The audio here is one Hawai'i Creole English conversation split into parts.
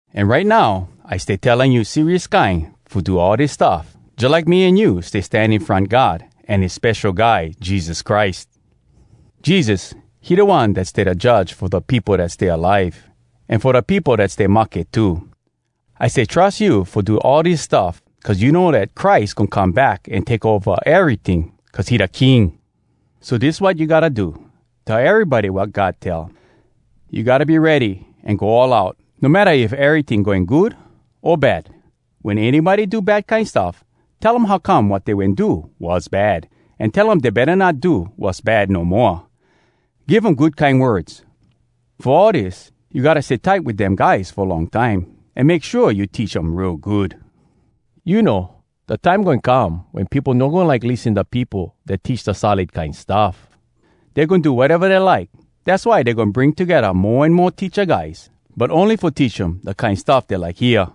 An right now I stay telling you serious kine fo do all dis stuff, jalike me an you stay stan in front God an his Spesho Guy Jesus Christ. Jesus, he da One dat stay da Judge fo da peopo dat stay alive, an fo da peopo dat stay mahke too. I stay trus you fo do all dis stuff, cuz you know dat Christ goin come back an take ova eryting, cuz he da King! So dis wat you gotta do: Tell erybody wat God tell. You gotta be ready an go all out, no matta if eryting going good o bad. Wen anybody do bad kine stuff, tell um how come wat dey wen do was bad, an tell um dey betta no do wass bad no moa. Give um good kine words. Fo all dis, you gotta stay tight wit dem guys fo long time, an make shua you teach um real good. You know, da time goin come, wen peopo no goin like lissen da peopo dat teach da solid kine stuff. Dey goin do wateva dey like. Dass why dey goin bring togedda mo an mo teacha guys, but ony fo teach um da kine stuff dey like hear.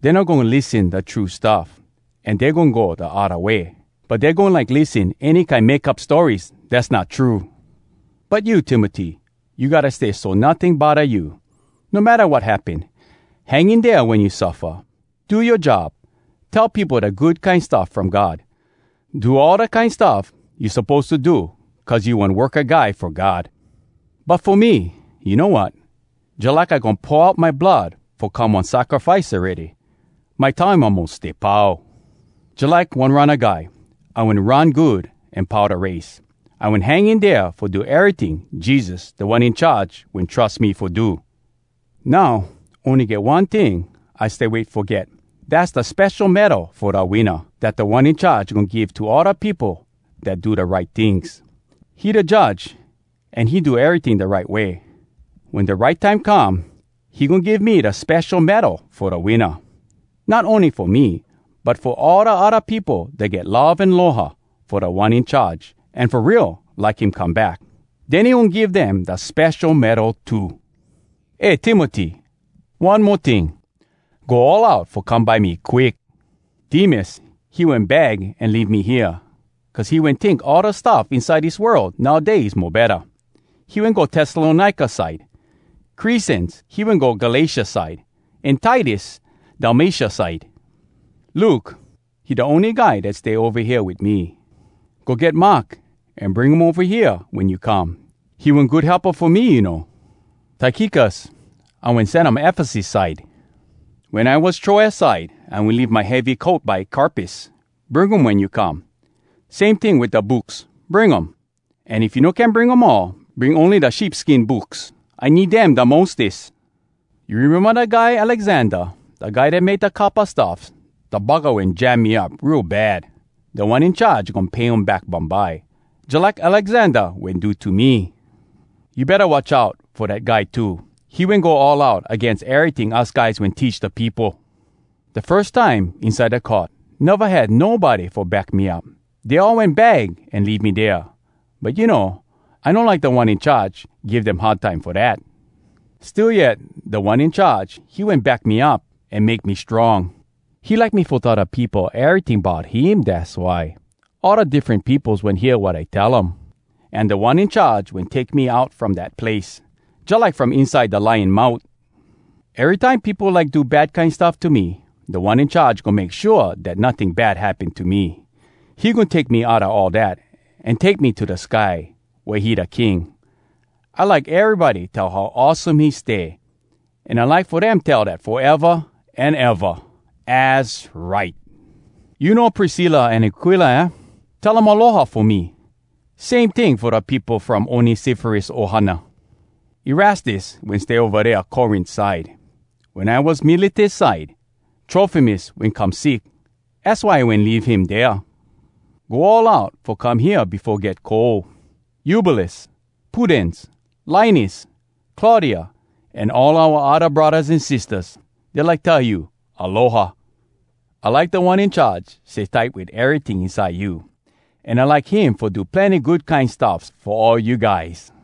Dey no goin lissen da true stuff, an dey goin go da odda way. But dey goin like lissen any kine make up stories dass not true. But you, Timoty, you gotta stay so notting bodda you, no matta wat happen. Hang in dea wen you suffa. Do yoa job: tell peopo da Good Kine Stuff from God. Do all da kine stuff you suppose to do cuz you one worka guy fo God. But fo me, you know wat? Jalike I goin pour out my blood fo come one sacrifice awready. My time almos stay pau. Jalike one runna guy, I wen run good an pau da race. I wen hang in dea fo do eryting Jesus, Da One In Charge, wen trus me fo do. Now, ony get one ting I stay wait fo get—dass da spesho medal fo da winna, dat Da One In Charge goin give to all da peopo dat do da right tings. He da Judge, an he do eryting da right way. Wen da right time come, he goin give me da spesho medal fo da winna. Not ony fo me, but fo all da odda peopo dat get love an aloha fo Da One In Charge, an fo real like him come back. Den he goin give dem dea spesho medal too. Eh, Timoty! One mo ting! Go all out fo come by me quick! Demas, he wen bag an leave me hea, cuz he wen tink all da stuff inside dis world nowdays mo betta. He wen go Tessalonika side. Cresens, he wen go Galatia side, an Titus, Dalmatia side. Luke, he da ony guy dat stay ova hea wit me. Go get Mark, an bring um ova hea wen you come. He one good helpa fo me, you know. Tykikus, I wen sen um Efesus side. Wen I was Troas side, I wen leave my heavy coat by Carpus—bring um wen you come. Same ting wit da books, bring um. An if you no can bring um all, bring ony da sheep skin books. I need dem da mostes. You rememba da guy Alexander, da guy dat make da coppa stuffs? Da buggah wen jam me up real bad! Da One In Charge goin pay him back bumbye, jalike Alexander wen do to me. You betta watch out fo dat guy too! He wen go all out agains eryting us guys wen teach da peopo! Da firs time inside da court, neva had nobody fo back me up. Dey all wen bag an leave me dea. But you know, I no like Da One In Charge give dem hard time fo dat. Still yet, Da One In Charge, he wen back me up an make me strong! He like me fo tell da peopo eryting bout him, dass why. All da diffren peopos wen hear wat I tell um. An Da One In Charge wen take me out from dat place, jalike from inside da lion mout. Erytime peopo like do bad kine stuff to me, Da One In Charge goin make shua dat notting bad happen to me. He goin take me outa all dat, an take me to da sky, wea he da King. I like erybody tell how awesome he stay, an I like fo dem tell dat foeva an eva! Az right! You know Priscilla an Aquila, aah? Tell um “Aloha!” fo me. Same ting fo da peopo from Onesiforus ohana. Erastus wen stay ova dea Corint side. Wen I was Miletus side, Trofimus wen come sick, az why I wen leave him dea. Go all out fo come hea befo get cold. Eubulus, Pudens, Linus, Claudia, an all oua odda braddahs an sistahs, dey like tell you “Aloha!” I like Da One In Charge stay tight wit eryting inside you. An I like him fo do plenny good kine stuffs fo all you guys!